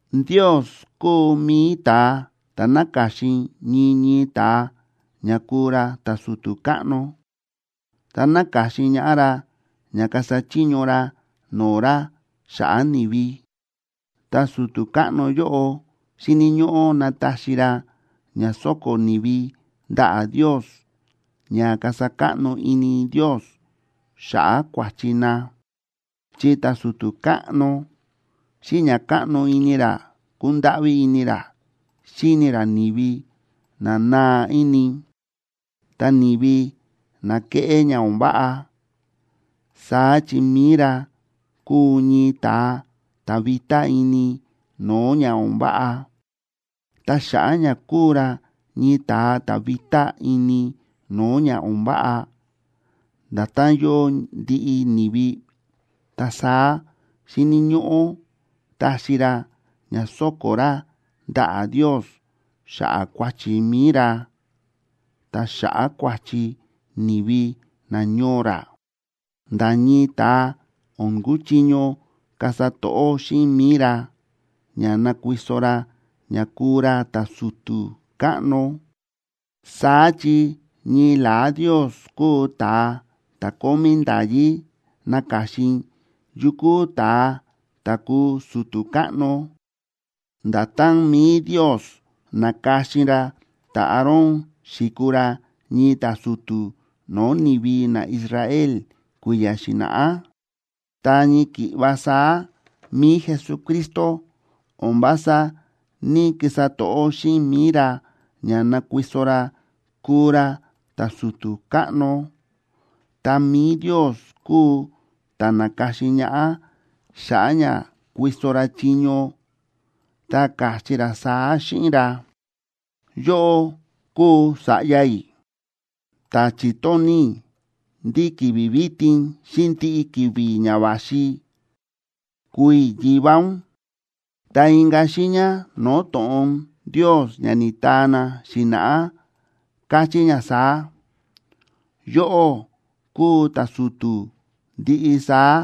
Ndios kúu mi̱i ta̱a ta̱ náka̱xin ñii ñii ta̱a ña kúu ra ta̱su̱tu̱ káꞌno, ta náka̱xin ñaꞌá ra ña kasa chiño ra no̱o̱ ra xa̱ꞌa̱ ni̱vi, ta su̱tu̱ káꞌno yóꞌo xíni̱ ñóꞌó nataxi ra ña so̱ko̱ ni̱vi ndaꞌa̱ Ndios ña kasa káꞌno ini Ndios xa̱ꞌa̱ kua̱chi na. Chi ta̱su̱tu̱ káꞌno, xíꞌin ña káꞌno ini ra kúndáꞌví ini ra xíni ra ni̱vi na naa ini, ta ni̱vi na kéꞌé ña o̱n váꞌa, saá chi mi̱i ra kúu ñii ta̱a ta̱ vitá ini no̱o̱ ña o̱n váꞌa. Ta xa̱ꞌa̱ ña kúu ra ñii ta̱a ta̱ vitá ini no̱o̱ ña o̱n váꞌa, nda̱tán yóo ndiꞌi ni̱vi, ta saá xíni̱ ñóꞌó taxi ra ña so̱ko̱ ra ndaꞌa̱ Ndios xa̱ꞌa̱ kua̱chi mi̱i ra, ta xa̱ꞌa̱ kua̱chi ni̱vi nañoo ra. Nda̱ ñii ta̱a o̱n kuchiño kasa to̱ꞌó xíꞌin mi̱i ra ña nakuiso ra ña kuu ra ta̱su̱tu̱ káꞌno, saá chi ñii la̱á Ndios kúu ta̱a ta̱ kómí nda̱yí naka̱xin yukú ta̱a ta̱ kuu su̱tu̱ káꞌno, nda̱tán mi̱i Ndios na̱ka̱xin ra ta̱Aarón xi̱kuu ra ñii ta̱su̱tu̱ no̱o̱ ni̱vi naIsrael kui̱ya̱ xi̱na̱ꞌá. Ta ñii ki̱ꞌva saá mi̱i Jesucristo o̱n vása ní‑kisa to̱ꞌó xíꞌin mi̱i ra ña nakuiso ra kuu ra ta̱su̱tu̱ káꞌno, ta mi̱i Ndios kúu ta̱ na̱ka̱xin ñaꞌá xa̱ꞌa̱ ña kuiso ra chiño, ta káchí ra saá xíꞌin ra: Yóꞌó kúu Sa̱ꞌya i̱, ta chi̱tóni̱ i̱ ndí ki̱vi̱ vitin xíꞌin ndiꞌi ki̱vi̱ ña va̱xi kúu i̱ Yivá ún. Ta inka̱ xiiña no̱o̱ to̱ꞌon Ndios ña ni̱taa na xi̱na̱ꞌá, káchí ña saá: Yóꞌó kúu ta̱su̱tu̱ ndiꞌi saá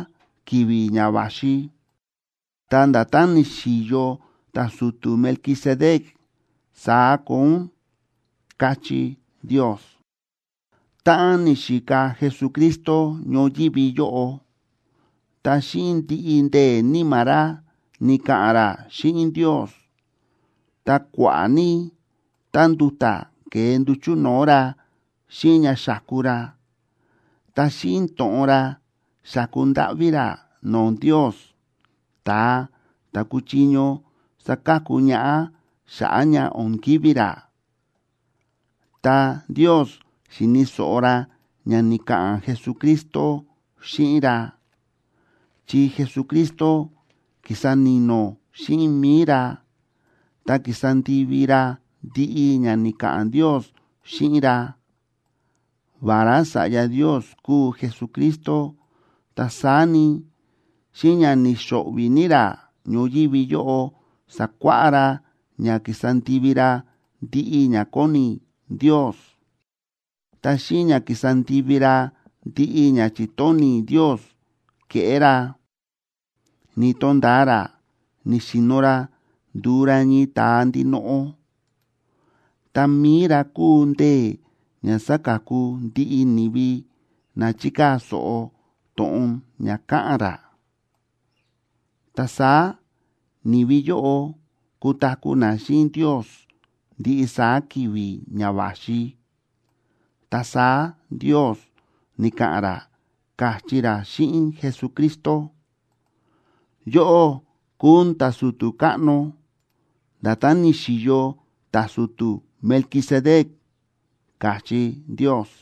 ki̱vi̱ ña va̱xi, ta nda̱tán ni̱xi̱yo ta̱su̱tu̱ Melquisedec, saá koo ún, káchí Ndios. Táꞌan ni̱xika Jesucristo ñoyívi yóꞌo, ta xíꞌin ndiꞌi ndee̱ níma̱ ra ni̱ka̱ꞌa̱n ra xíꞌin Ndios, ta kua̱ꞌa̱ ní tánduta̱ ke̱e nduchu̱ no̱o̱ ra xíꞌin ña xáku ra, ta xíꞌin to̱ꞌon ra xáku ndáꞌví ra no̱o̱ Ndios, ta̱a ta̱ kúchiño saka̱ku ñaꞌá xa̱ꞌa̱ ña o̱n kivi̱ ra. Ta Ndios xi̱ni̱ so̱ꞌo ra ña ni̱ka̱ꞌa̱n Jesucristo xíꞌin ra, chi Jesucristo ki̱sa ni̱no̱ xíꞌin mi̱i ra ta ki̱sa ndivi ra ndiꞌi ña ni̱ka̱ꞌa̱n Ndios xíꞌin ra. Vará Sa̱ꞌya Ndios kúu Jesucristo, ta saá ni, xíꞌin ña ni̱xo̱ꞌvi̱ ní ra ñoyívi yóꞌo sa̱kuáꞌá ra ña ki̱sa ndivi ra ndiꞌi ña kóni Ndios. Ta xíꞌin ña ki̱sa ndivi ra ndiꞌi ña chi̱tóni̱ Ndios keꞌé ra, ni̱to̱nda̱a ra ni̱xi̱no̱ ra ndu̱u ra ñii ta̱a ndinoꞌo, ta mi̱i ra kúu ndee̱ ña saka̱ku ndiꞌi ni̱vi na chíkaa̱ so̱ꞌo to̱ꞌon ña káꞌa̱n ra, ta saá ni̱vi yóꞌo kutaku̱ na xíꞌin Ndios ndiꞌi saá ki̱vi̱ ña va̱xi. Ta saá Ndios ni̱ka̱ꞌa̱n ra, káchí ra xíꞌin Jesucristo: “Yóꞌó kúu ún ta̱su̱tu̱ káꞌno, nda̱tán ni̱xi̱yo ta̱su̱tu̱ Melquisedec”, káchí Ndios.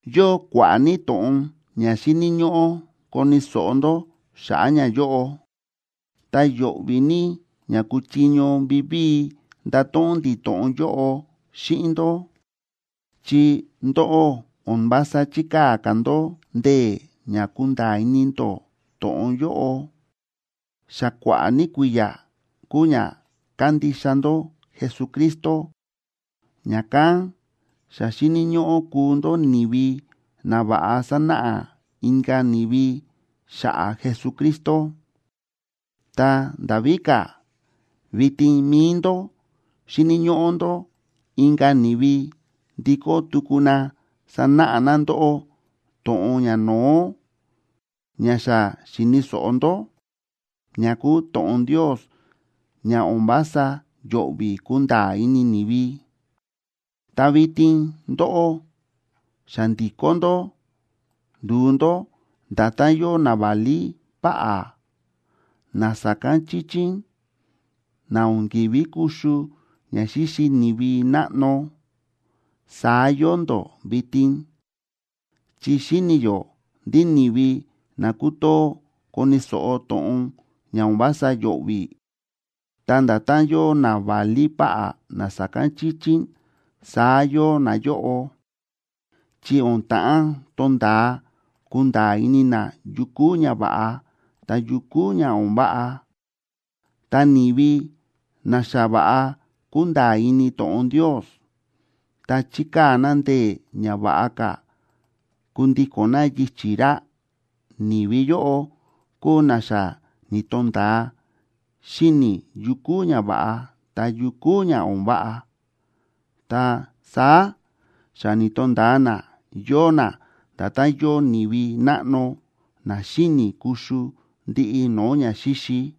Yóo kua̱ꞌa̱ ní to̱ꞌon ña xíni̱ ñóꞌó koni̱ so̱ꞌo ndó xa̱ꞌa̱ ñayóꞌo, ta yo̱ꞌvi̱ ní ña kuchiño vivíi ndato̱ꞌon ndi̱ to̱ꞌon yóꞌo xíꞌin ndó, chi ndóꞌó o̱n vása chíkaa̱ ka̱ ndó ndee̱ ña kunda̱a̱ ini ndó to̱ꞌon yóꞌo. Xa kua̱ꞌa̱ ní kui̱ya̱ kúu ña kándixa ndó Jesucristo, ña̱kán xa xíni̱ ñóꞌó kuu ndó ni̱vi na va̱ꞌa sanáꞌa inka̱ ni̱vi xa̱ꞌa̱ Jesucristo. Ta nda̱ víka̱, vitin mi̱i ndó xíni̱ ñóꞌó ndó inka̱ ni̱vi ndikó tuku na sanáꞌa na ndóꞌó to̱ꞌon ñano̱ó ña xa xi̱ni̱ so̱ꞌo ndó, ña kúu to̱ꞌon Ndios ña o̱n vása yo̱ꞌvi̱ kunda̱a̱ ini ni̱vi. Ta vitin ndóꞌó xa ndi̱kó ndó ndu̱u ndó nda̱tán yóo naválí páꞌá, na sa̱kán chíchín, na o̱n ki̱ví kuxu ña xíxi ni̱vi náꞌno, saá yóo ndó vitin. Chi xíni̱ yó ndí ni̱vi na kútoo koni̱ so̱ꞌo to̱ꞌon ña o̱n vása yo̱ꞌvi̱, ta nda̱tán yóo naválí páꞌá na sa̱kán chíchín, saá yóo nayóꞌo, chi o̱n ta̱ꞌán tonda̱a kunda̱a̱ ini na yu kúu ña va̱ꞌa ta yu kúu ña o̱n váꞌa. Ta ni̱vi na xa va̱ꞌa kúnda̱a̱ ini to̱ꞌon Ndios, ta chíkaa̱ na ndee̱ ña va̱ꞌa ka̱ kundíko̱n na yichi̱ ra, ni̱vi yóꞌo kúu na xa ni̱to̱nda̱a xíni̱ yu kúu ña va̱ꞌa ta yu kúu ña o̱n váꞌa, ta saá xa ni̱to̱nda̱a na yóo na nda̱tán yóo ni̱vi náꞌno na xíni̱ kuxu ndiꞌi no̱o̱ ñaxíxi.